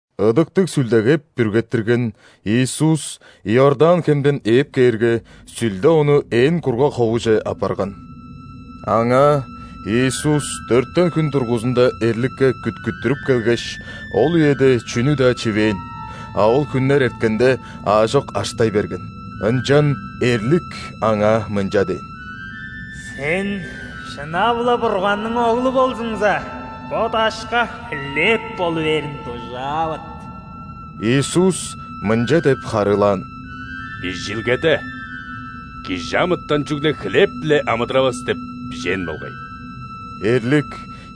Ыдыктыг Сүлдеге бүргеттирген Иисус Иордан хемден ээп кээрге, Сүлде Ону ээн кургаг ховуже аппарган. Аңаа Иисус дөртен хүн дургузунда эрликке күткүттүрүп келгеш, ол үеде чүнү-даа чивээн, а ол хүннер эрткенде, аажок аштай берген. Ынчан эрлик Аңаа мынча дээн: «Сен шынап-ла Бурганның Оглу болзуңза, бо дашка хлеб болу бээрин дужаавыт». Иисус мынча деп харыылаан: «Бижилгеде: „Кижи амытан чүгле хлеб-биле амыдыравас“ – деп бижээн болгай». Эрлик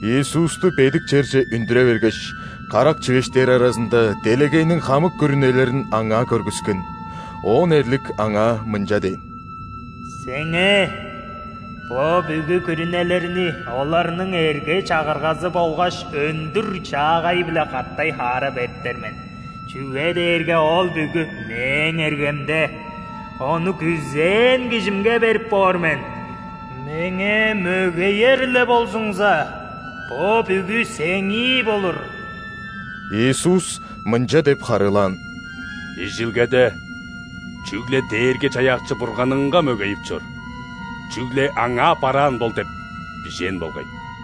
Иисусту бедик черже үндүре бергеш, карак чивеш дээр аразында делегейниң хамык күрүнелерин Аңаа көргүскен. Оон эрлик Аңаа мынча дээн: «Сеңээ бо бүгү күрүнелерни оларның эрге-чагыргазы болгаш өндүр-чаагайы-биле катай-хаара бериптер мен, чүге дээрге ол бүгү мээң эргемде; ону күзээн кижимге берип боор мен. Меңээ мөгеер-ле болзуңза, бо бүгү Сээңии болур». Иисус мынча деп харыылаан: «Бижилгеде: „Чүгле Дээрги-Чаяакчы Бурганыңга мөгейип чор, чүгле Аңаа бараан бол“ – деп бижээн болгай».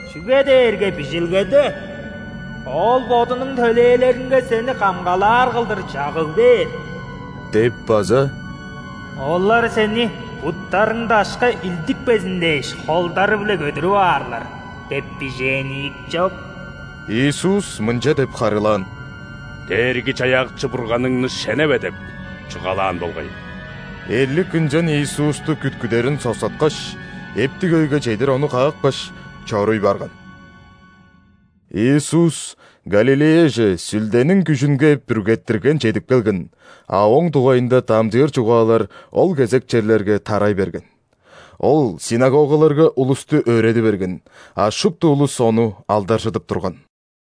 чүге дээрге Бижилгеде „Ол Бодунуң төлээлеринге Сени камгалаар кылдыр чагыг бээр“ деп база „Олар сени, буттарың дашка илдикпезин дээш, холдары-биле көдүрүп аарлар“ деп бижээн ийик чоп». Иисус мынча деп харыылаан: «„Дээрги-Чаяакчы Бурганыңны шеневе“ – деп чугаалаан болгай». Эрлик ынчан Иисусту күткүдерин соксаткаш, эптиг өйге чедир Ону каапкаш, чоруй барган. Иисус Галилеяже Сүлдениң күжүнге бүргеттирген чедип келген, а Ооң дугайында дамчыыр чугаалар ол кезек черлерге тарай берген. Ол ·синагогаларга улусту өөреди берген, а шупту улус Ону алдаржыдып турган.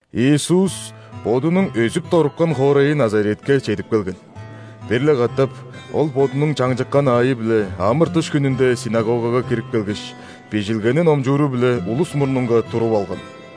Иисус Бодунуң өзүп-доруккан хоорайы Назаретке чедип келген. Бир-ле катап Ол Бодунуң чаңчыккан аайы-биле ·амыр-дыш хүнүнде синагогага кирип келгеш, Бижилгени номчууру-биле улус мурнунга туруп алган.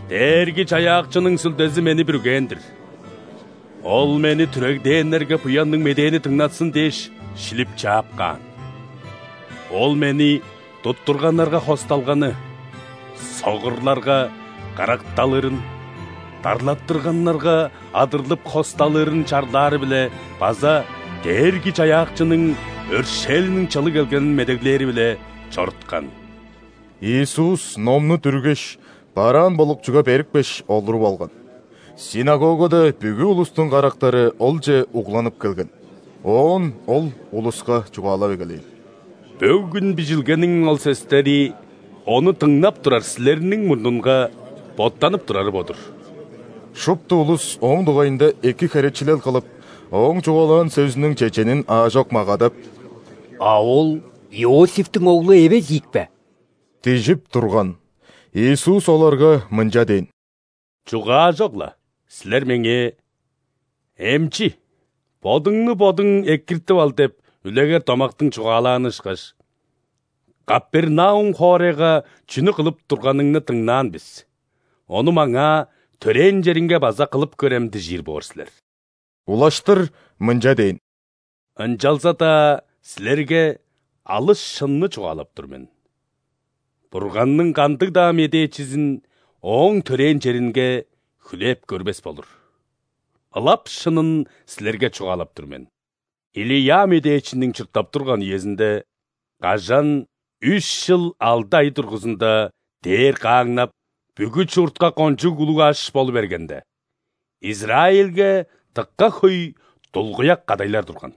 «Дээрги-Чаяакчының Сүлдези мени бүргээн-дир –Ол мени түрегдээннерге буянныг медээни дыңнатсын дээш шилип чаап каан.Ол Мени туттурганнарга хосталганы, согурларга каракталырын,дарлаттырганнарга адырлып хосталырын чарлаары-биле базаДээрги-Чаяакчының өршээлиниң чылы келгенин медеглээри-биле чоруткан». Иисус номну дүргеш, бараан болукчуга берипкеш, олуруп алган. Синагогада бүгү улустуң карактары Олче угланып келген. Оон Ол улуска чугаалап эгелээн: «Бөгүн Бижилгениң ол сөстери ону дыңнап турар силерниң мурнунга боттанып турары бо-дур». Шупту улус Ооң дугайында эки херечилел кылып, Ооң чугаалаан сөзүнүң чеченин аажок магадап: «А Ол Иосифтиң оглу эвес ийикпе?» – дижип турган. Иисус оларга мынча дээн: «Чугаажок-ла, силер Меңээ: „Эмчи, бодуңну бодуң экиртип ал“ деп үлегер домактың чугаалааны ышкаш, „Капернаум хоорайга чүнү кылып турганыңны дыңнаан бис, ону маңаа, төрээн чериңге база кылып көрем“ – дижир боор силер». Улаштыр мынча дээн: «Ынчалза-даа силерге алыс шынны чугаалап тур мен: Бурганның кандыг-даа медээчизин ооң төрээн черинге хүлээп көрбес болур. Ылап шынын силерге чугаалап тур мен: Илия медээчиниң чурттап турган үезинде, кажан үш чыл алды ай дургузунда дээр кааңнап, бүгү чуртка кончуг улуг аш болу бергенде, Израильге дыка хөй дулгуяк кадайлар турган.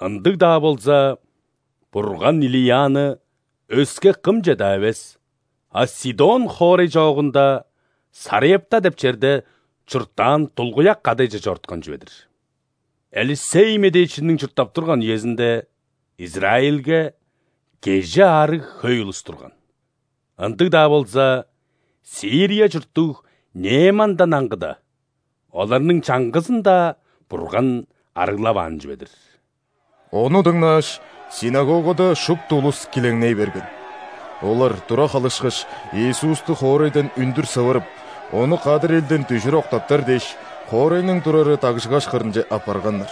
Ындыг-даа болза, Бурган Илияны өске кымче-даа эвес, а Сидон хоорай чоогунда Сарепта деп черде чурттаан дулгуяк кадайже чоруткан чүве-дир. Элисей медээчиниң чурттап турган үезинде Израильге кежи аарыг хөй улус турган, ындыг-даа болза, Сирия чурттуг Неемандан аңгыда, оларның чаңгызын-даа Бурган арыглаваан чүве-дир». Ону дыңнааш, ·синагогада шупту улус килеңней берген. Олар тура халышкаш, Иисусту хоорайдан үндүр сывырып, Ону кадыр элден дүжүр октаптар дээш, хоорайның турары дагжыгаш кырынче аппарганнар.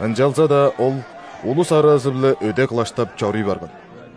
Ынчалза-даа Ол улус аразы-биле өде кылаштап чоруй барган.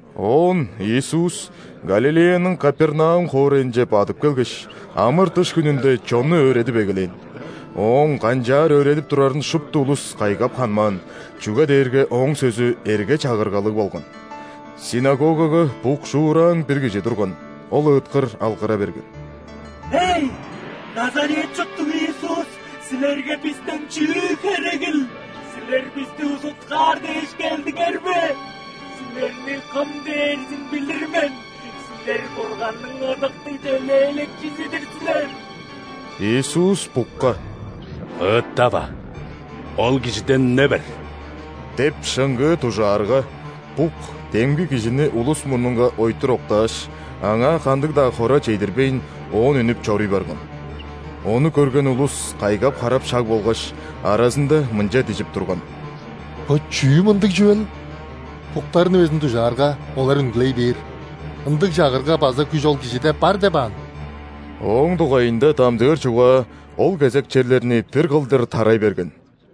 Оон Иисус Галилеяның Капернаум хоорайынче бадып келгеш, ·амыр-дыш хүнүнде чонну өөредип эгелээн. Ооң канчаар өөредип турарын шупту улус кайгап ханмаан, чүге дээрге Ооң сөзү эрге-чагыргалыг болган. Синагогага букшуураан бир кижи турган, ол ыыткыр алгыра берген: «Эй! Назарет чурттуг Иисус, Силерге бистен чүү херегил? Силер бисти узуткаар дээш келдиңер бе? Силерни кым дээрзин билир мен, Силер – Бурганның Ыдыктыг Төлээлекчизи-дир силер!» Иисус букка: «Ыыттава, ол кижиден үне бер!» – деп шыңгыы дужаарга, бук демги кижини улус мурнунга ойтур октааш, аңаа кандыг-даа хора чедирбейн, оон үнүп чоруй барган. Ону көрген улус кайгап-харап шаг болгаш, аразында мынча дижип турган: «Бо чүү мындыг чүвел? Буктарны безин дужаарга, олар үнгүлей бээр, ындыг чагырга база күш ол Кижиде бар деп аан?» Ооң дугайында дамчыыр чугаа ол кезек черлерни бир кылдыр тарай берген.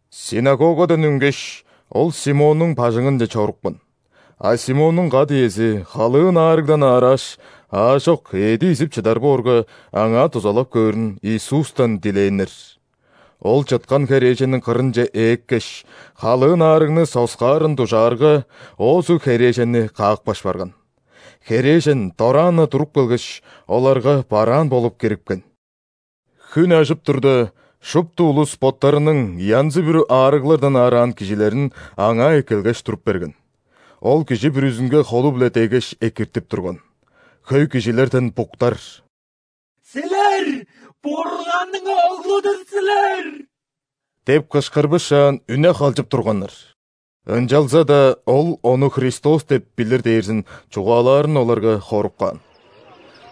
Синагогадан үнгеш, Ол Симоннуң бажыңынче чорупкан; а Симоннуң кат-иези халыын аарыгдан аарааш, аажок эъди изип чыдар боорга, аңаа дузалап көөрүн Иисустан дилээннер. Ол чыткан херээженниң кырынче ээккеш, халыын аарыгны соксаарын дужаарга, оозу херээженни каапкаш барган. Херээжен дораан-на туруп келгеш, оларга бараан болуп кирипкен. Хүн ажып турда, шупту улус боттарының янзы-бүрү аарыглардан аараан кижилерин Аңаа эккелгеш туруп берген. Ол кижи бүрүзүнге холу-биле деггеш, экиртип турган. Хөй кижилерден буктар: «Силер – Бурганның Оглу-дур силер!» – деп кышкырбышаан, үне халчып турганнар. Ынчалза-даа Ол Ону Христос деп билир дээрзин чугаалаарын оларга хоруп каан.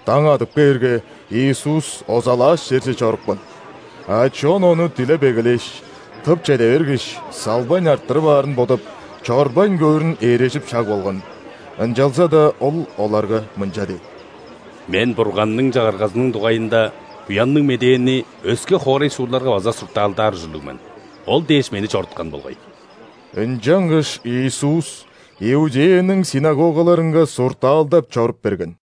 Даң адып кээрге, Иисус озалааш черже чорупкан. А чон Ону дилеп эгелээш, тып чеде бергеш, салбайн арттырып аарын бодап, чорбайн көөрүн ээрежип шаг болган. Ынчалза-даа Ол оларга мынча дээн: «Мен Бурганның Чагыргазының дугайында Буянныг Медээни өске хоорай-суурларга база суртаалдаар ужурлуг мен; ол дээш Мени чоруткан болгай». Ынчангаш Иисус Иудеяның ·синагогаларынга суртаалдап чоруп берген.